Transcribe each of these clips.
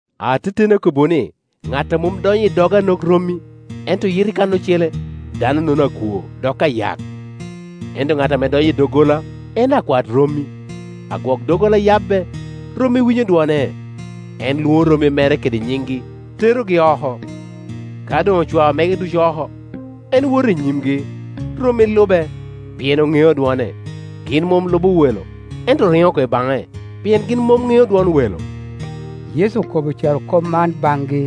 “Ateteni akobbiwu ni, ŋat a mom donyo i dog an ok rommi, ento yito i kan ocele, dano-nono akwo, dok ayak; ento ŋat ame donyo i doggola, en akwat rommi. Agwok-doggola yabbe, rommi winyo dwone; en lwoŋo rommi mere kede nyiŋgi, terogi oko. Ka doŋ ocwao mege ducu oko, en woto i nyimgi, rommi lube, pien oŋeo dwone. Gin mom lubo welo, ento oriŋo oko i baŋe, pien gin mom ŋeo dwon welo.” Yecu okobo carokop man baŋgi,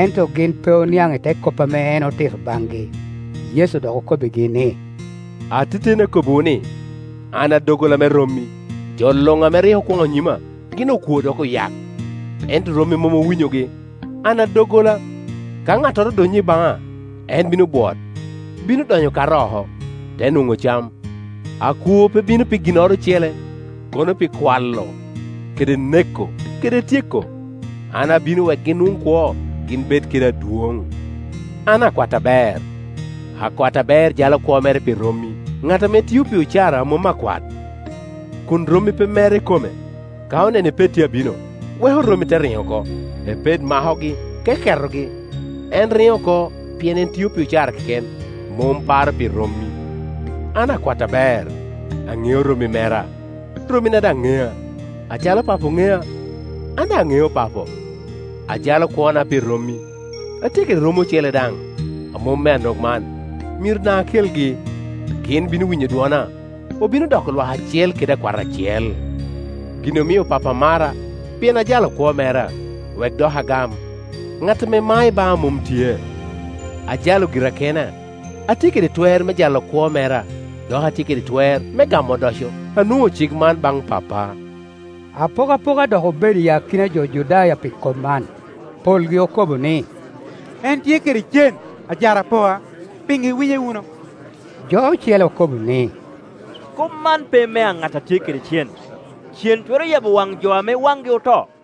ento gin pe oniaŋ i te kop ame en otito baŋgi. Yecu dok okobbigi ni, “Ateteni akobbiwu ni, an a doggola me rommi. Jo luŋ ame rik okwoŋo nyima gin okwo dok oyak; ento rommi mom owinyogi. An a doggola; ka ŋattoro odonyo i baŋa en bino bwot; bino donyo, kato oko, te nwoŋo cam. Akwo pe bino pi ginnoro ocele, kono pi kwalo, kede neko, kede tyeko; an abino wek gin nwoŋ kwo, gin bed kede adwoŋ. An akwat aber. Akwat aber jalo kwo mere pi rommi. Ŋat ame tio pi ocara, a mom akwat, kun rommi pe mere ikome, ka oneno apet tye abino, weko rommi te riŋo oko; epet makogi, keketogi. En riŋo oko, pien en tio pi ocara keken, mom paro pi rommi. An akwat aber; aŋeo rommi mera, rommina daŋ ŋea. Acalo Papo ŋea, an daŋ aŋeo Papo; ajalo kwona pi rommi. Atye kede rommi ocele daŋ, a mom me an ok man, myero daŋ akelgi. Gin bino winyo dwona, obino doko lwak acel kede akwat acel. Gin omio Pappa mara, pien ajalo kwo mera, wek doki agam. Ŋat ame mao i baŋa mom tye; ajalo gira kena. Atye kede twer me jalo kwo mera, dok atye kede twer me gamo odoco; anwoŋo cik man baŋ Pappa.” Apokapoka dok obedo i akina jo Judaya pi kop man. Polgi okobo ni, “En tye kede cen, ajarapoa; pi ŋo iwinye wunu?” Jo ocele okobo ni, “Kop man pe mea ŋat a tye kede cen. Cen twero yabo waŋ jo ame wangi oto?”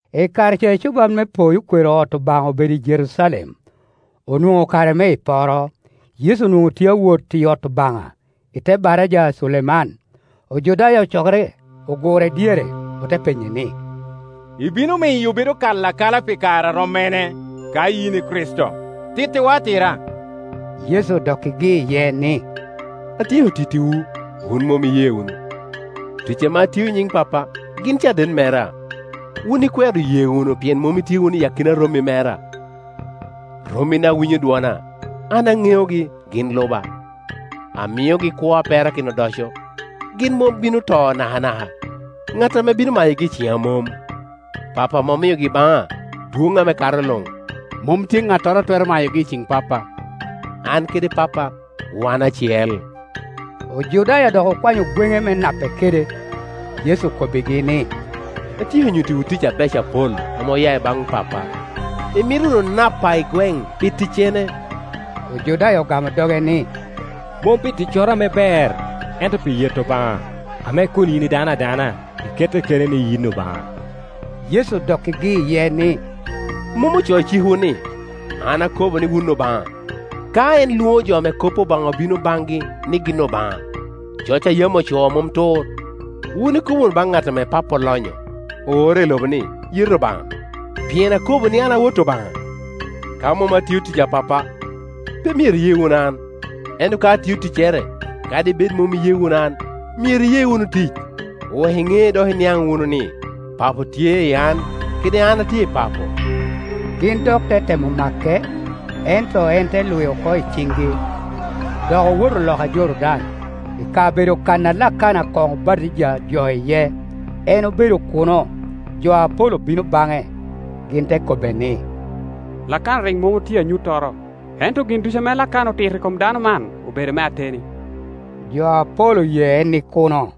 I kare ca ecuban me poyo kwero ot Obaŋa obedo i Jerucalem; Onwoŋo kare me iporo, Yecu onwoŋo tye a wot i ot Obaŋa, i te baraja a Culeman. Ojudaya ocokere, ogure dyere, ote penye ni, “Ibino miyo obedo kala akala pi kare a rom mene? Ka yin i Kricito, tittiwa atira.” Yecu odokkigi iye ni, “Atye ko tittiwu, wun mom iye wunu. Tic ame atio i nyiŋ Pappa gin caden mera. Wun ikwero ye wunu pien mom itye wunu i akina rommi mera. Rommina winyo dwona; an aneogi, gin luba, amiogi kwo a perakino odoco. Gin mom bino to nakanaka; ŋat ame bino mayogi i ciŋa mom. Pappa ame omiogi baŋa dwon ame kato luŋ, mom tye ŋattoro a twero mayogi i ciŋ Pappa. An kede Pappa wan acel.” Ojudaya dok okwanyo gwene me nape kede. Yecu okobbigi ni, “Atyeko nyuttiwu tic abeco apol ame oya i baŋ Pappa; imito wunu napa i gweŋ pi ticcene?” Ojudaya ogamo doge ni, “Mom pi ticcoro ame ber, ento pi yeto Obaŋa, ame kun yin i dano adana, ikette keni ni yin Obaŋa.” Yecu odokkigi iye ni, “Mom ocoo i cikwu ni, ‘An akobo ni wun obaŋa?’ Ka en lwoŋo jo ame kop Obaŋa obino baŋgi ni gin obaŋa, (coc a yam ocoo mom tur) wun ikobo wunu baŋ ŋat ame Papo olonyo, oore i lobo ni, ‘Yeto Obaŋa’, pien akobo ni, ‘An a Wot Obaŋa?’ Ka mom atio tic a Pappa, pe myero iye wunu an; ento ka atio ticcere, kadi bed mom iye wunu an, myero iye wunu tic, wek iŋe dok iniaŋ wunu ni, Papo tye i an, kede an atye i Papo.” Gin dok te temo make, ento en te lwi oko i ciŋgi. Dok owoto loka Jordan, i kabedo kan a Lakana koŋ obatija jo iye. En obedo kuno, jo apol obino baŋe. Gin te kobbe ni, “Lakana rik mom otio anyuttoro, ento gin ducu ame Lakana otito i kom dano man obedo me ateni.” Jo apol oye en i kuno.